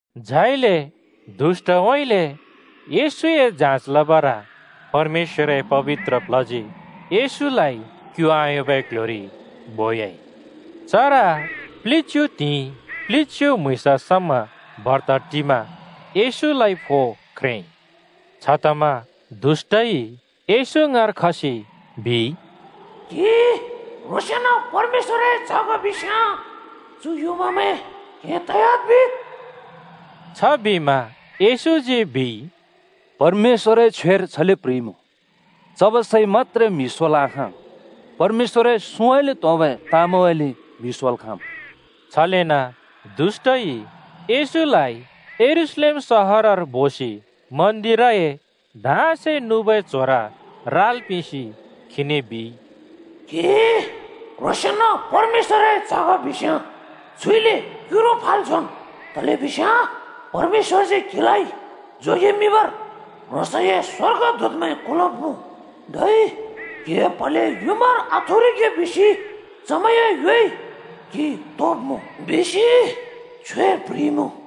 झाइले दुष्‍टउँइँले येशूए जाँच लबर परमेश्‍वरए पबित्र प्ल्हजी येशूलाइ क्यु आयोंबै क्ल्ह्‍योरि बोयाइ। चर प्लिच्‍यु त्हिंइ प्लिच्यु म्हुँइँस समा बर्त टिमा येशूलाइ फो ख्रेंइ। छतमा दुष्‍टइ येशू ङाँर खसि बिइ, “क्‍हि क्‍ह्रोंसेंन परमेश्‍वरए च्‍ह ग बिस्‍याँ चु युँमामैं ‘क्हें तयाद्,’ बिद्।” छबिमा येशूजी बिइ, “परमेश्‍वरए छ्वेर छले प्‍ह्रिइमुँ, ‘चबै सैइ मत्‍त्रे म्हि सोल् आखाँ, परमेश्‍वरए सुँउँइँले त्‍होंबै ताँमैंउँइँले म्‍हि सोल् खाँम्।’” छलेन दुष्‍टइ येशूलाइ यरूशलेम सहरर बोसि मन्दिरए धाँसे नुबै च्‍होर राल् पिंसि खीने बिइ, “क्‍हि क्‍ह्रोंसेंन परमेश्‍वरए च्‍ह ग बिस्‍याँ छुइले क्युरु फाल् झोंन्। तलेबिस्याँ ‘परमेश्‍वरजी क्हिलाइ जोगेमिंबर ह्रोंसए स्‍वर्गदूतमैं कुलब्मुँ। धै क्हिए प्हले युँमार आथुरिगे बिसि चमैंए योइ क्‍हि तोब्मुँ,’ बिसि छ्वेर प्ह्रिइमुँ।”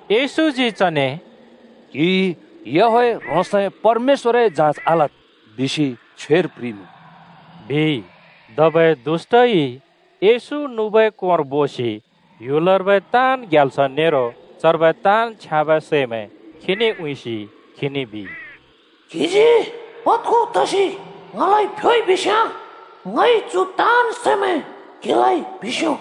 येशूजी चने “‘क्‍हिइ याहवेह ह्रोंसए परमेश्‍वरए जाँच आलद्!’ बिसि छ्वेर प्‍ह्रिइमुँ,” बिइ। धबै दुष्‍टइ येशू नुबै कोंर बोसि ह्‍युलर्बै ताँन् ग्याल्स नेरो चर्बै ताँन् छ्याँबै सैमैं खीने उँइँसि खीने बिइ, “क्‍हिजी पद्खु तसि ङलाइ फ्‍योइ बिस्‍याँ ङइ चु ताँन् सैमैं क्हिलाइ पिंस्यो।”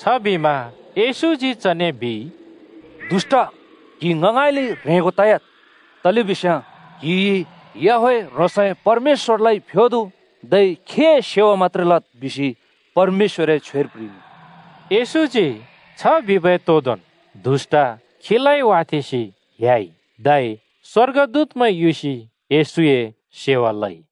छबिमा येशूजी चने बिइ, “दुष्‍ट, क्हि ङ ङाँइँले ह्रेंगो तयाद्! तलेबिस्याँ ‘क्‍हिइ याहवेह ह्रोंसए परमेश्‍वरलाइ फ्‍योदु, धै खीए सेवा मत्‍त्रे लद्,’ बिसि परमेश्‍वरए छ्वेर प्‍ह्रिइमुँ।” येशूजी छ बिबै तोदोंन् दुष्‍ट खीलाइ वाथेंसि ह्‍याइ। धै स्‍वर्गदूतमैं युसि येशूए सेवा लइ।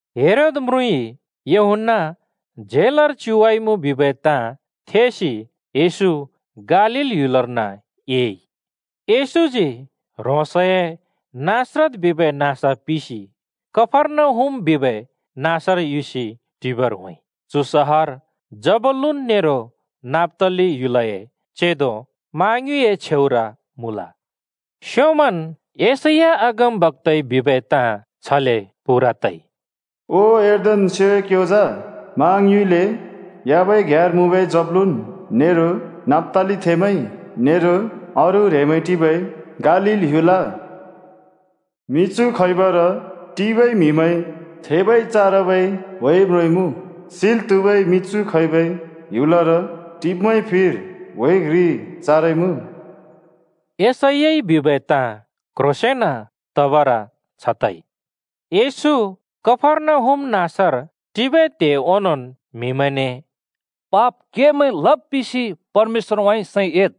हेरोद म्रुँइ यूहन्‍ना झेलर च्युवाइमुँ बिबै ताँ थेसि येशू गालील ह्‍युलर्न एइ। येशूजी ह्रोंसए नासरत बिबै नाँस पिसि कफर्नहुम बिबै नाँसर युसि टिबर होंइ। चु सहर जबूलून नेरो नप्‍ताली ह्‍युलए चेंदो मा ङ्युए छेउर मुँ। स्‍योंमन् यशैया अगमबक्‍ताइ बिबै ताँ छले पूरा तइ: “ओ यर्दन स्‍योंए क्‍योंजा मा ङ्युउँइँले ह्‍याबै घ्‍याँर मुँबै जबूलून नेरो नप्‍तालीथेंमैं नेरो अरू ह्रेंमैं टिबै गालील ह्‍युल। मिछु खैबर टिबै म्हिमैंइ थेबै चारबै ह्‍वे म्रोंइमुँ। सिल् त्‍हुबै मिछु खैबै ह्‍युलर टिब्मैंए फिर ह्‍वे घ्रि चारइमुँ।” यशैयाइ बिबै ताँ क्ह्रोंसेंन तबर छ तइ। येशू कफर्नहुम नाँसर टिबै त्हे ओंनोंन् म्हिमैंने “पाप केमैं लब् पिसि परमेश्‍वरउँइँ सैं एद्,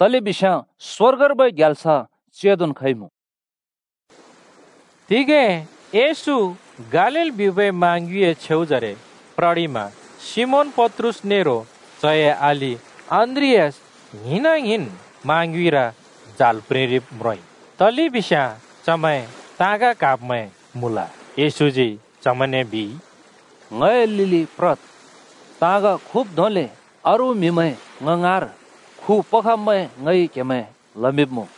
तलेबिस्याँ स्‍वर्गर्बै ग्याल्स (राज्‍य) चेंदोन् खइमुँ बिबर होंइ।” तिगें येशू गालील बिबै मा ङ्युँइए छेउजरे प्ररिमा सिमोन पत्रुस नेरो चए अलि अन्‍द्रियास ङ्हिंना-ङ्हिंन् मा ङ्युँइर जाल प्रिंरिब म्रोंइ। तलेबिस्याँ चमैं ताँग क्हाब्‍मैं मुँल। येशूजी चमैंने बिइ, “ङए लिलि प्रद्। ताँग खुब् धोंले अरू म्‍हिमैं ङ ङाँर खुपखब्‍मैं ङइ क्हेमैं लमिंब्मुँ।”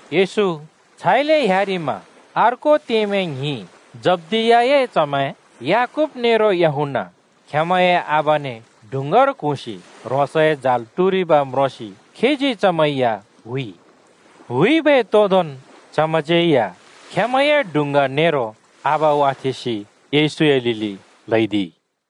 येशू छाइले ह्‍यारिमा अर्को त्येमैं ङ्हिं, जब्दियाए च्‍हमैं याकूब नेरो यूहन्‍ना खेंमैंए आबाने डुँङ्गार क्हुँसि ह्रोंसए जाल टुरिब म्रोंसि खीजी चमैं या हुइ। हुइबै तोदोंन् चमैंज्‍यै या खेंमैंए डुँङ्गा नेरो आबा वाथेंसि येशूए लिलि ल्‍हैदिइ।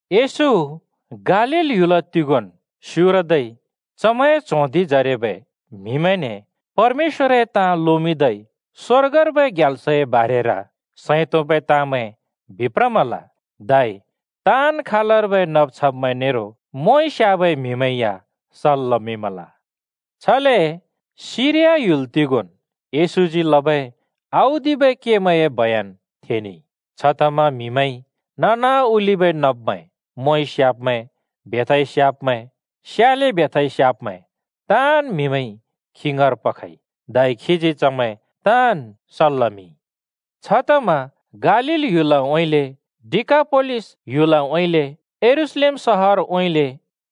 येशू गालील ह्‍युल तिगोंन् स्‍युरदै चमैंए च्हों धिंजरेबै म्हिमैंने परमेश्‍वरए ताँमैं लोमिंदै स्‍वर्गर्बै ग्याल्सए बारेर सैं तोंबै ताँमैं बिप्रमल। धै ताँन् खालर्बै नब् छब्मैं नेरो मोंइ स्याबै म्‍हिमैं या सल् लमिंमल। छले सिरिया ह्‍युल तिगोंन् येशूजी लबै औदिबै केमैंए बयन थेनेइ। छतमा म्‍हिमैंइ ननाओलिबै नब्‍मैं, मोंइ स्‍याब्‍मैं, र बेथाइ स्याब्‍मैं, स्याले बेथाइ स्याब्‍मैं ताँन् म्हिमैंइ खी ङाँर पखइ, धै खीजी चमैं ताँन् सल् लमिंमल। छतमा गालील ह्‍युलउँइँले, डिकापोलिस ह्‍युलउँइँले, यरूशलेम सहरउँइँले,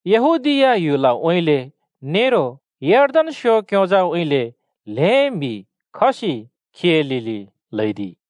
यहूदीया ह्‍युलउँइँले नेरो यर्दन स्‍यों क्‍योंजाउँइँले ल्हें म्हि खसि खीए लिलि ल्हैदिइ।